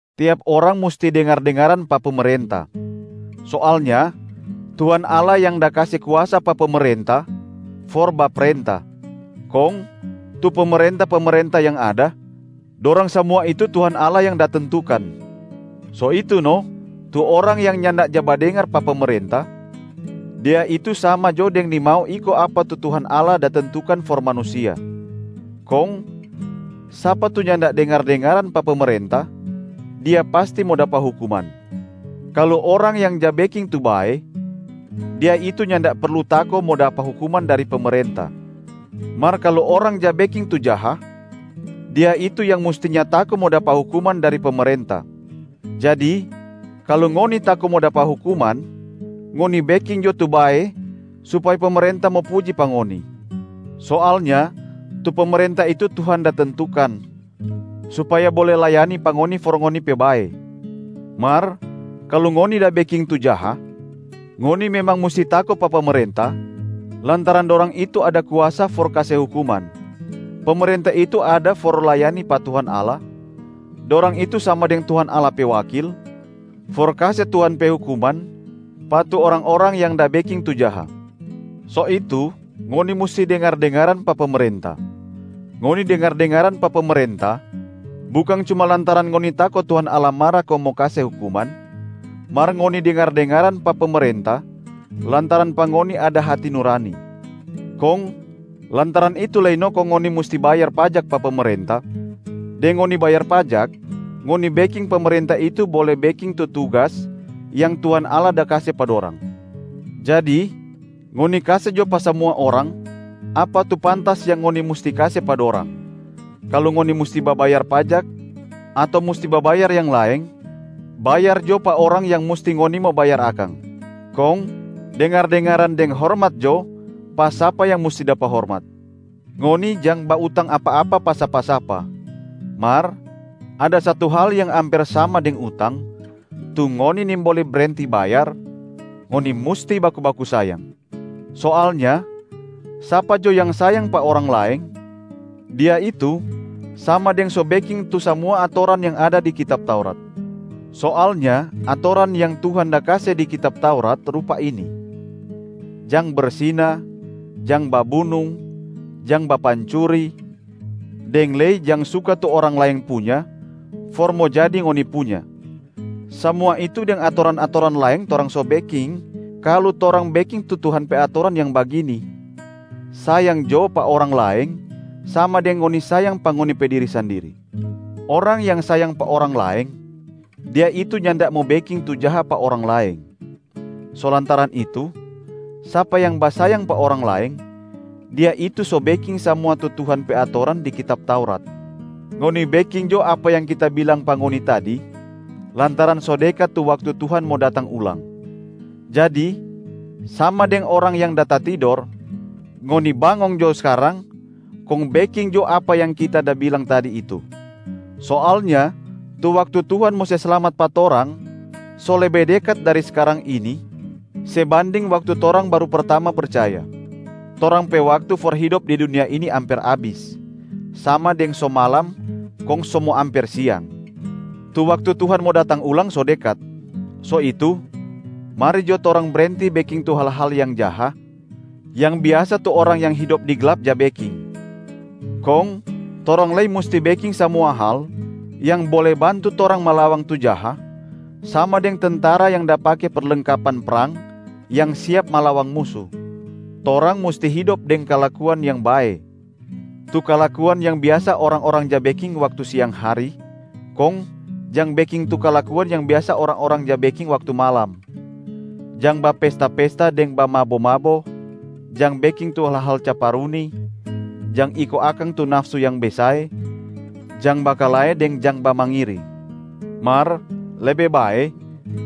Tiap orang musti dengar-dengaran pa pemerenta. Soalnya Tuhan Allah yang da kase kuasa pa pemerenta for baprenta. Kong tu pemerenta-pemerenta yang ada, dorang samua itu Tuhan Allah yang da tentukan. So itu no tu orang yang nyanda ja badengar pa pemerenta, dia itu sama jo deng nimau iko apa tu Tuhan Allah da tentukan for manusia. Kong sapa tu nyanda dengar-dengaran pa pemerenta dia pasti mo dapa hukuman. Kalu orang yang ja beking tu bae, dia itu nyanda perlu tako mo dapa hukuman dari pemerenta. Mar kalu orang ja beking tu jaha, dia itu yang mustinya tako mo dapa hukuman dari pemerenta. Jadi kalu ngoni tako mo dapa hukuman, ngoni beking jo tu bae supaya pemerenta mo puji pa ngoni. Soalnya tu pemerenta itu Tuhan da tentukan supaya bole layani pa ngoni for ngoni pe bae. Mar kalu ngoni da beking tu jaha, ngoni memang musti tako pa pemerenta lantaran dorang itu ada kuasa for kase hukuman. Pemerenta itu ada for layani pa Tuhan Allah, dorang itu sama deng Tuhan Allah pe wakil for kase Tuhan pe hukuman pa tu orang-orang yang da beking tu jaha. So itu, ngoni musti dengar-dengaran pa pemerenta. Ngoni dengar-dengaran pa pemerenta bukang cuma lantaran ngoni tako Tuhan Allah mara kong mo kase hukuman, mar ngoni dengar-dengaran pa pemerenta lantaran pa ngoni ada hati nurani. Kong lantaran itu lei no kong ngoni musti bayar pajak pa pemerenta. Deng ngoni bayar pajak, ngoni beking pemerenta itu bole beking tu tugas yang Tuhan Allah da kase pa dorang. Jadi ngoni kase jo pa samua orang apa tu pantas yang ngoni musti kase pa dorang: kalu ngoni musti babayar pajak ato musti babayar yang laeng, bayar jo pa orang yang musti ngoni mo bayar akang. Kong dengar-dengaran deng hormat jo pa sapa yang musti dapa hormat. Ngoni jang bautang apa-apa pa sapa-sapa, mar ada satu hal yang amper sama deng utang tu ngoni nimbole brenti bayar, ngoni musti baku-baku sayang. Soalnya sapa jo yang sayang pa orang laeng, dia itu sama deng so beking tu samua atoran yang ada di kitab Taurat. Soalnya atoran yang Tuhan da kase di kitab Taurat rupa ini: jang bersina, jang babunung, jang bapancuri, deng lei jang suka tu orang laeng punya for mo jadi ngoni punya. Samua itu deng atoran-atoran laeng torang so beking, kalu torang beking tu Tuhan pe atoran yang bagini, “Sayang jo pa orang laeng sama deng ngoni sayang pa ngoni pe diri sandiri.” Orang yang sayang pa orang laeng, dia itu nyanda mo beking tu jaha pa orang laeng. So lantaran itu, sapa yang basayang pa orang laeng, dia itu so beking samua tu Tuhan pe atoran di kitab Taurat. Ngoni beking jo apa yang kita bilang pa ngoni tadi lantaran so dekat tu waktu Tuhan mo datang ulang. Jadi sama deng orang yang da tatidor, ngoni bangong jo skarang kong beking jo apa yang kita da bilang tadi itu. Soalnya tu waktu Tuhan mo se slamat pa torang so lebe dekat dari skarang ini se banding waktu torang baru pertama percaya. Torang pe waktu for hidop di dunia ini amper abis, sama deng so malam kong so mo amper siang. Tu waktu Tuhan mo datang ulang so dekat. So itu, mari jo torang brenti beking tu hal-hal yang jaha, yang biasa tu orang yang hidop di glap ja beking. Kong torang lei musti beking samua hal yang bole bantu torang malawang tu jaha, sama deng tentara yang da pake perlengkapan prang yang siap malawang musu. Torang musti hidop deng kalakuan yang bae, tu kalakuan yang biasa orang-orang ja beking waktu siang hari, kong jang beking tu kalakuan yang biasa orang-orang ja beking waktu malam: jang bapesta-pesta deng bamabo-mabo, jang beking tu hal-hal caparuni, jang iko akang tu nafsu yang besae, jang bakalae deng jang bamangiri. Mar lebe bae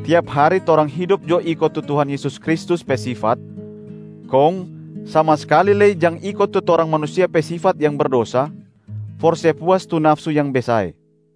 tiap hari torang hidop jo iko tu Tuhan Yesus Kristus pe sifat, kong sama skali lei jang iko tu torang manusia pe sifat yang berdosa for se puas tu nafsu yang besae.